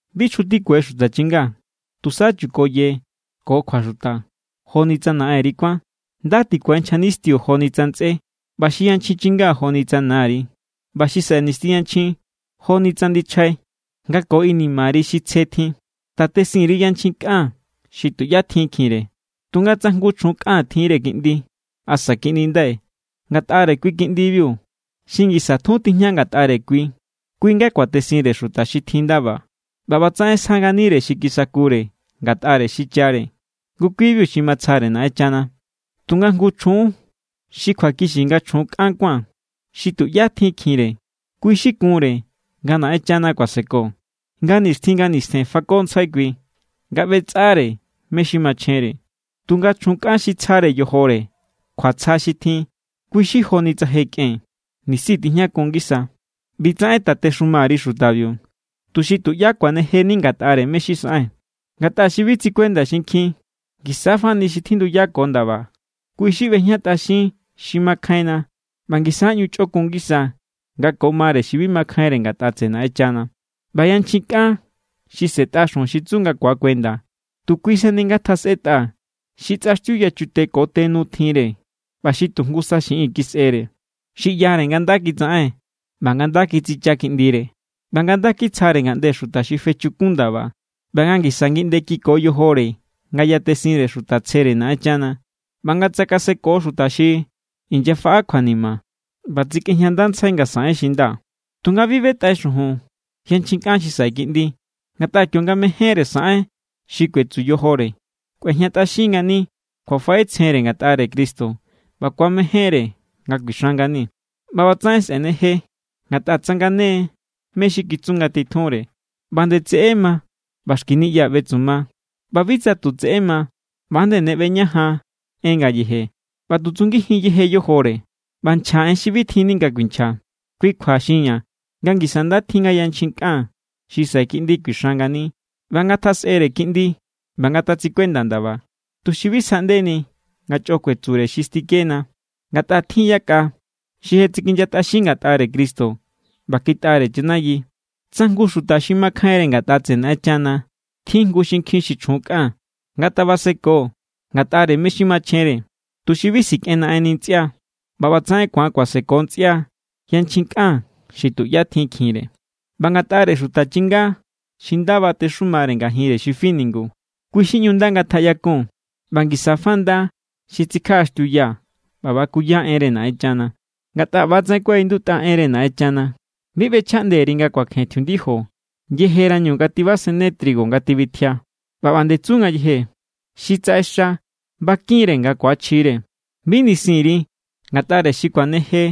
Bi chjutikue xuta chinga, tusa chukoye ko kjuaxuta joni tsa naꞌenri kuán. Nda tikue nchja nistiu joni tsa ntsꞌé, ꞌba xi yanchjin chinga joni tsa nari, ꞌba xi saꞌe nisti yanchjin joni tsa ndichjai nga ko inimari xi tsje tjin. Tatesin_ri yanchjin kꞌan xi tuꞌyá tjinkjinre. Tunga tsa jngu chjun kꞌan tjinre kiꞌndi asa kiꞌndindai, ngatꞌare kui kiꞌndibiu, xi ngisa tjun tijña ngatꞌare kui, kui= nga kuatesinre xuta xi tjin ndaba. ꞌBa ꞌbatsaꞌen sja nganire xi kisakure ngatꞌare xichare. Ngu kui=biu xi matsjare Naꞌenchana. Tunga jngu chjun xi kjuakixi nga chjun kꞌan kuán, xi tuꞌyá tjinkjinre, kui xi kunre nga Naꞌenchana kuaseko. Nga nixtjin nga nistjen fakontsjai kui nga ꞌbetsꞌare mé= xi machjenre. Tunga chjun kꞌan xi tsjare yojore kjuatsja xi tjin, kui= xi joni tsa je kꞌen, nisi tijñakun ngisa. ꞌBitsaꞌen tatexuma_ri xutabiu, tuxi tuꞌyá kuanejeni ngatꞌare mé= xi saꞌen. Ngatꞌa xi bi tsikuenda xinkjin, ngisa= fani xi tjinduyako ndaba, kui xi ꞌbejñatꞌaxin xi makjainna ꞌba ngisa= ꞌñu chꞌokun ngisa nga ko mare xi bi makjainre ngatꞌa tseꞌe Naꞌenchana. ꞌBa yanchjin kꞌan xi sꞌe̱tꞌa xujun xi tsu nga ku̱akuenda, tu kui sani ngatjasꞌetꞌa xi tsꞌaxtiu yachute ko te nu tjinre ꞌba xi tu jngusa xiꞌin kisꞌere, xi ꞌyare nga nda kitsaꞌen, ꞌba nga nda kitsicha kiꞌndire, ꞌba nga kitsjare ngaꞌnde xuta xi fechukun ndaba, ꞌba nga ngisa ngiꞌnde kiko yojore nga yatesinre xuta tsjere Naꞌenchana, ꞌba nga tsakaseko xuta xi inyafaꞌa kjuanima, ꞌba tsikꞌejñandantsjai nga saꞌen xi nda. Tunga bi ꞌbetꞌai xujun yanchjin kꞌan xi saꞌe kiꞌndi. Ngatꞌa kionga mejénre saꞌen xi kuetsu yojore, kꞌuejñatꞌaxin=ngani kjuafaꞌetsjenre ngatꞌare Cristo ꞌba ku̱amejénre nga kuixan ngani. ꞌBa ꞌbatsaꞌen sꞌe̱neje, ngatꞌa tsangane= mé= xi kitsu ngatitjunre. ꞌBa nde tseꞌé ma ꞌba xki niꞌya ꞌbetsuma. ꞌBa bi tsa tu tseꞌé ma, ꞌba nde ne ꞌbeñajan en ngayeje, ꞌba tu tsungijin yeje yojore, ꞌba nchja en xi bi tjinni nga kuinchja. Kui kjua, xinña̱ nga ngisa nda tjin nga yanchjin kꞌan xi saꞌe kiꞌndi kuixan ngani, ꞌba nga ngatjasꞌere kiꞌndi ꞌba nga ngatatsikuenda ndaba, tuxi bi sjaꞌndeni nga chꞌo kuetsure xi stikena. Ngatꞌa tjin= yakꞌa xi je tsikinyatꞌaxin ngatꞌare Cristo ꞌba kitꞌare chanayi. Tsa jngu xuta xi makjainre ngatꞌa tseꞌe Naꞌenchana tjin jngu xinkjin xi chjun kꞌan, ngatabaseko ngatꞌare mé= xi machjenre, tuxi bi sikꞌenaꞌenni ntsꞌia. ꞌBa ꞌbatsaꞌen ku̱an kuaseko ntsꞌia yanchjin kꞌan xi tuꞌyá tjinkjinre. ꞌBa ngatꞌare xuta chinga xi nda batexumare ngajinre xi fi ningu, kui= xi ꞌñu nda ngatjaꞌyakun, ꞌba ngisa fa nda xi tsikjaꞌaxtiuya ꞌba bakuya enre Naꞌenchana. Ngatꞌa ꞌbatsaꞌen kuaꞌindutꞌa enre Naꞌenchana: “Bi ꞌbechjaꞌnde_ri nga kuakjen tjiundijo yejerañu nga tibasenne trigo nga tibitjia.” ꞌBa ꞌba nde tsu ngayeje: “Xi tsaꞌexa bakin=re nga ku̱achjire.” Bi nisin_ri ngatꞌare xi kuaneje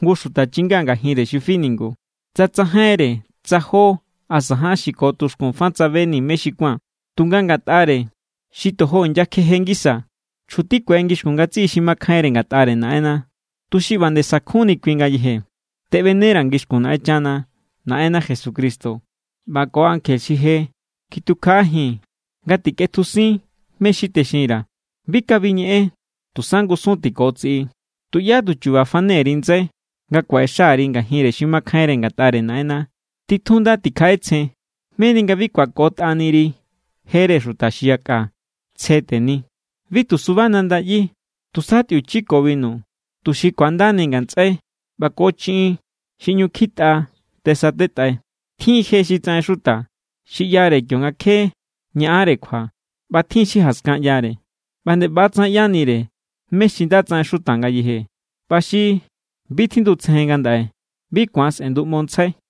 jngu xuta chinga ngajinre xi fi ningu, tsa tsajainre tsa jó asa ján xi ko tuxkun fa tsabeni mé xi kuán. Tunga ngatꞌare xi tojo inyakjeje ngisa, chjutikue ngixkun ngatsiꞌi xi makjainre ngatꞌare Naꞌenna, tuxi ꞌba nde sakjunni kui ngayeje. Teꞌbenera̱ ngixkun Naꞌenchana, Naꞌenna Jesucristo ꞌba ko ankje xi je kitukjaꞌajin nga tikꞌetjusin mé= xi texinra̱. Bi kabi ñeꞌen, tusa ngusun= tikotsiꞌi. Tuꞌyá tu chuba fane_ri ndsai nga kuaꞌexa_ri ngajinre xi makjainre ngatꞌare Naꞌenna. Titjun nda tikjaꞌetsjen, meni nga bi kꞌuakotꞌari jere xuta xi yakꞌa. Tsje teni. Bi tu suba nanda ꞌyi. Tusa tꞌiuchi ko binu, tuxi ku̱andani ngatsꞌai ꞌba ko chiꞌin xi ꞌñu kjitꞌa tesatetꞌai. Tjin je xi tsaꞌen xuta xi ꞌyare kionga kje ñaꞌanre kjua ꞌba tjin xi jaskan ꞌyare. ꞌBa nde ꞌbatsaꞌen ꞌyanire mé= xi nda tsaꞌen xuta ngayeje, ꞌba xi bi tjindutsejen ngandaꞌe bi ku̱an sꞌe̱nduꞌmontsjai.